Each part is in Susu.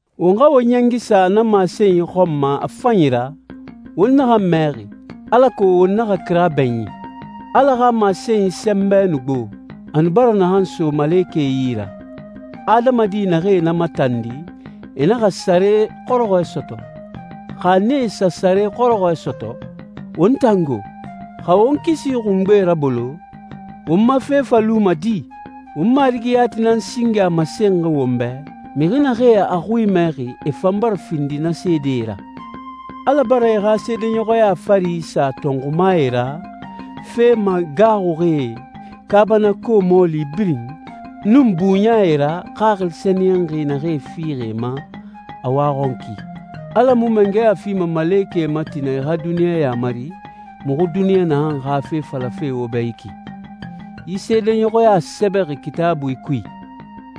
Won xa won ɲɛngi sa na masenyi xɔn ma a fanyi ra, won naxan mɛxi, alako won naxa kira bɛɲin. Ala xa masenyi sɛnbɛ nu gbo, a nu bara naxan so malekɛe yi ra. Adamadi naxee na matandi, e naxa sare xɔrɔxɔɛ sɔtɔ. Xa nee sa sare xɔrɔxɔɛ sɔtɔ, won tan go? Xa won kisi xungbe rabolo, won ma fe fa luma di? Won Marigi yati nan singe a masenxi won bɛ, mixi naxee a xui mɛxi e fan bara findi na seedee ra. Ala bara e xa seedeɲɔxɔya fari isa tɔnxumae ra, fe magaaxuxie, kaabanako mɔɔli birin, nun buɲae ra Xaxili Sɛniyɛnxi naxee fixi e ma a waxɔnki. Ala mu mangɛya fima malekɛe ma tina e xa duniɲa yamari, muxu duniɲa naxan xa fe falafe wo bɛ yi ki. Yi seedeɲɔxɔya sɛbɛxi Kitaabui kui: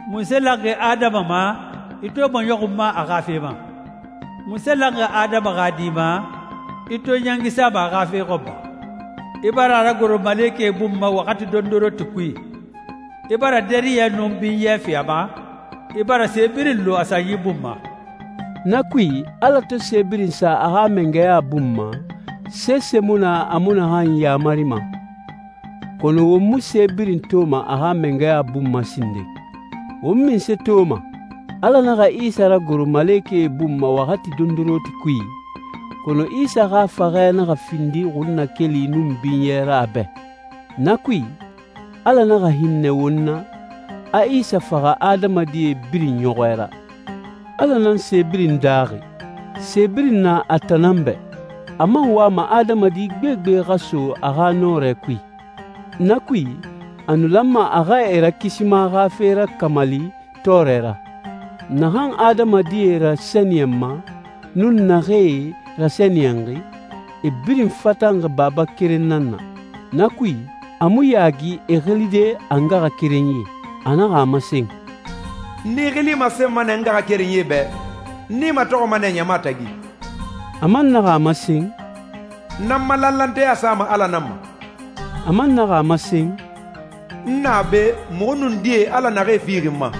«Munse lanxi adama ma, i to i maɲɔxunma a xa fe ma? Munse lanxi adama xa di ma, i to i ɲɛngi sama a xa fe xɔn ma? I bara a ragoro malekɛe bun ma waxati dondoronti kui. I bara dariyɛ nun binyɛ fi a ma, i bara se birin lu a sanyi bun ma.» Na kui, Ala to se birin sa a xa mangɛya bun ma, sese mu na a mu naxan yamarima. Kɔnɔ won mu se birin toma a xa mangɛya bun ma sinden. Won munse toma? Ala naxa Isa ragoro malekɛe bun ma waxati dondoronti kui, kɔnɔ Isa xa faxɛ naxa findi xunnakeli nun binyɛ ra a bɛ. Na kui, Ala naxa hinnɛ won na, a Isa faxa adamadi birin ɲɔxɔɛ ra. Ala nan se birin daaxi, se birin na a tan nan bɛ. A man wama adamadi gbegbe xa so a xa nɔrɛ kui. Na kui, a nu lanma a xa e Rakisima xa fe rakamali tɔɔrɛ ra. Naxan adamadie rasɛniyɛnma, nun naxee rasɛniyɛnxi, e birin fatanxi Baba keren nan na. Na kui, a mu yaagi e xilide a ngaxakerenyie. A naxa a masen, «N i xili masenma nɛ n ngaxakerenyie bɛ, n i matɔxɔma nɛ ɲama tagi.» A man naxa a masen, «N nan n ma lanlanteya sama Ala nan ma.» A man naxa a masen, «N na be, muxu nun die Ala naxee fixi n ma.»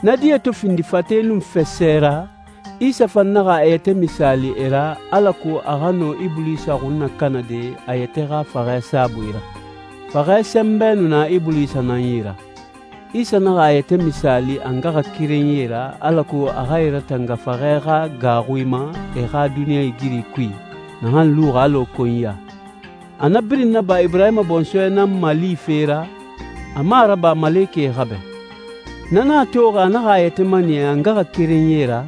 Na die to findi fate nun fasɛ ra, Isa fan naxa a yɛtɛ misaali e ra, alako a xa nɔ Ibulisa xun nakanade a yɛtɛ xa faxɛ saabui ra. Faxɛ sɛnbɛ nu na Ibulisa nan yi ra. Isa naxa a yɛtɛ misaali a ngaxakerenyie ra alako a xa e ratanga faxɛ xa gaaxui ma e xa duniɲɛigiri kui, naxan luxi alɔ konyiya. A na birin naba Iburahima bɔnsɔɛ nan malife ra, a mu a raba malekɛe xa bɛ. Na nan a toxi a naxa a yɛtɛ maniya a ngaxakerenyie ra,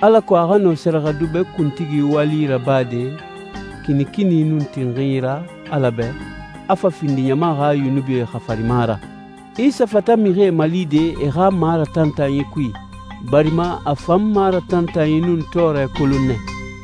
alako a xa nɔ sɛrɛxɛdubɛ kuntigi wali rabade kinikini nun tinxinyi ra Ala bɛ, a fa findi ɲama xa yunubie xafarima ra. Isa fata mixie malide e xa maratantanyi kui, barima a fan maratantanyi nun tɔɔrɛ kolon nɛ.